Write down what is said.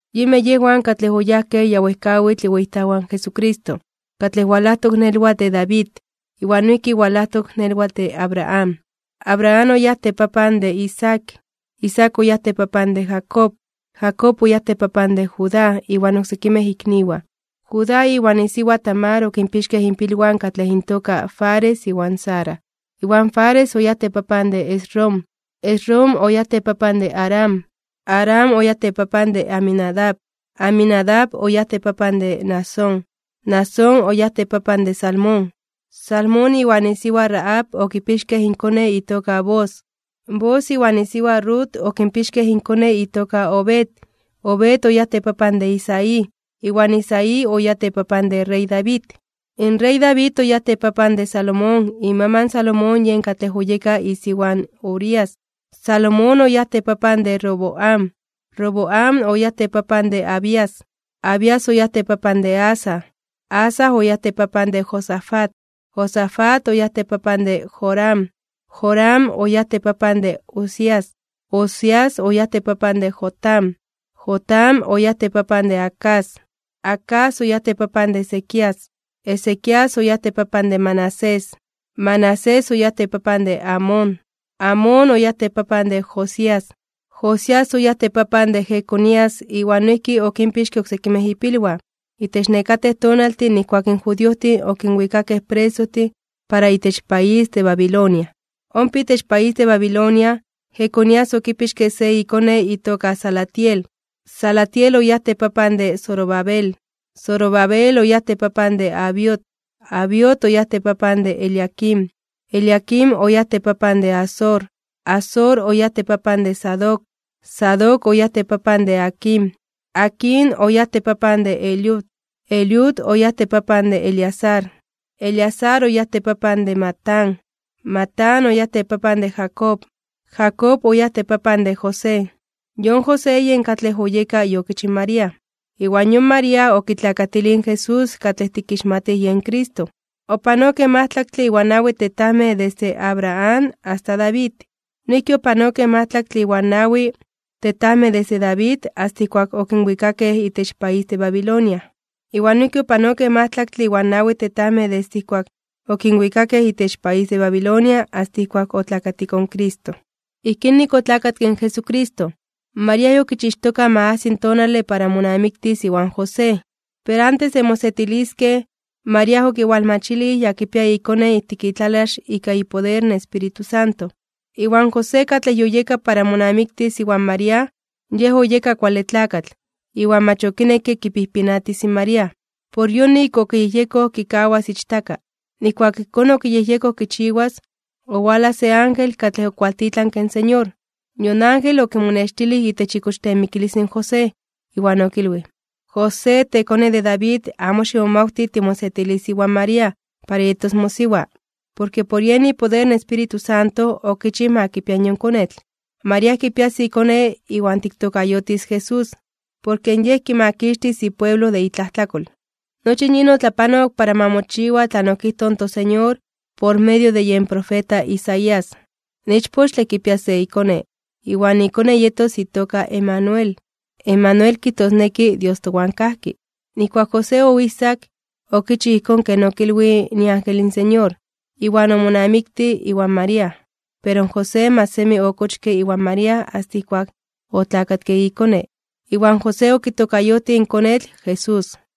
Yinmej yejwan katlej oyajkej ya wejkawitl iweyitajwan in Jesucristo, katlej walajtok nelwatl de David, iwan noijki walajtok nelwatl de Abraham. Abraham oyáj tepapan de Isaac. Isaac oyáj tepapan de Jacob. Jacob oyáj tepapan de Judá iwan oksekimej ikniwan. Judá iwan isiwa Tamar okinpixkej inpilwan katlej intoka Fares iwan Zara. Iwan Fares oyáj tepapan de Esrom. Esrom oyáj tepapan de Aram. Aram oyáj tepapan de Aminadab. Aminadab oyáj tepapan de Naasón. Naasón oyáj tepapan de Salmón. Salmón iwan isiwa Rahab okipixkej inkone itoka Booz. Booz iwan isiwa Rut okipixkej inkone itoka Obed. Obed oyáj tepapan de Isaí. Iwan Isaí oyáj tepapan de yen rey David. In rey David oyáj tepapan de Salomón. Imaman in Salomón yen katlej oyeka isiwa in Urías. Salomón oyáj tepapan de Roboam. Roboam oyáj tepapan de Abías. Abías oyáj tepapan de Asa. Asa oyáj tepapan de Josafat. Josafat oyáj tepapan de Joram. Joram oyáj tepapan de Uzías. Uzías oyáj tepapan de Jotam. Jotam oyáj tepapan de Acaz. Acaz oyáj tepapan de Ezequías. Ezequías oyáj tepapan de Manasés. Manasés oyáj tepapan de Amón. Amón oyáj tepapan de Josías. Josías oyáj tepapan de Jeconías iwan noijki okinpixke oksekimej ipilwan, itech nekatej tonaltin nijkuak in judiojtin okinwikakej presojtin para itech país de Babilonia. Ompa itech país de Babilonia, Jeconías okipixke se ikone itoka Salatiel. Salatiel oyáj tepapan de Zorobabel. Zorobabel oyáj tepapan de Abiud. Abiud oyáj tepapan de Eliaquim. Eliaquim oyáj tepapan de Azor. Azor oyáj tepapan de Sadoc. Sadoc oyáj tepapan de Aquim. Aquim oyáj tepapan de Eliud. Eliud oyáj tepapan de Eleazar. Eleazar oyáj tepapan de Matán. Matán oyáj tepapan de Jacob. Jacob oyáj tepapan de José. Yon José yen katlej oyeka iokich in María. Iwan yon María okitlakatilij in Jesús katlej tikixmatij yen Cristo. Opanokej majtlaktle iwan nawi tetajmej desde Abraham asta David. Noijki opanokej majtlaktle iwan nawi tetajmej desde David asta ijkuak okinwikakej itech país de Babilonia. Iwan noijki opanokej majtlaktle iwan nawi tetajmej desde ijkuak okinwikakej itech país de Babilonia asta ijkuak otlakatiko in Cristo. Ijkín nik otlakatke in Jesucristo. María yokichixtoka ma ajsi tonale para monamiktis iwan José. Pero antes de mosetiliskej, María okiwalmachilij ya kipia ikone ijtik itlalax ika ipoder in Espíritu Santo. Iwan José, katlej yoyeka para monamiktis iwan María, yej oyeka kuale tlakatl, iwan mach okinekke kipijpinatis in María. Por yonik okiyejyekoj kikawas ichtaka. Nijkuak ijkón okiyejyekoj kichiwas, owalaj se ángel katlej okualtitlanke in Señor. Yon ángel okimonextilij itech ikochteemikilis in José, iwan okilwij: ―José, tekone de David, amo ximomawti timosetilis iwan María para yetos mosiwa. Porke por yen ipoder in Espíritu Santo okichij ma kipia yon konetl. María kipias ikone, iwan tiktokayotis JESÚS, porke Yej kimakixtis ipueblo de itlajtlakol. Nochi in yin otlapanok para ma mochiwa tlan okijtoj in toSeñor por medio de yen profeta Isaías: In ichpochtle kipias se ikone, iwan ikone yetos itoka Emanuel, Emanuel kijtosneki: Dios towan kajki. Nijkuak José oijsak, okichij ijkón ken okilwij iángel in Señor, iwan omonamiktij iwan María. Pero in José mach semi okochke iwan María asta ijkuak otlakatke ikone, iwan José okitokayotij in konetl Jesús.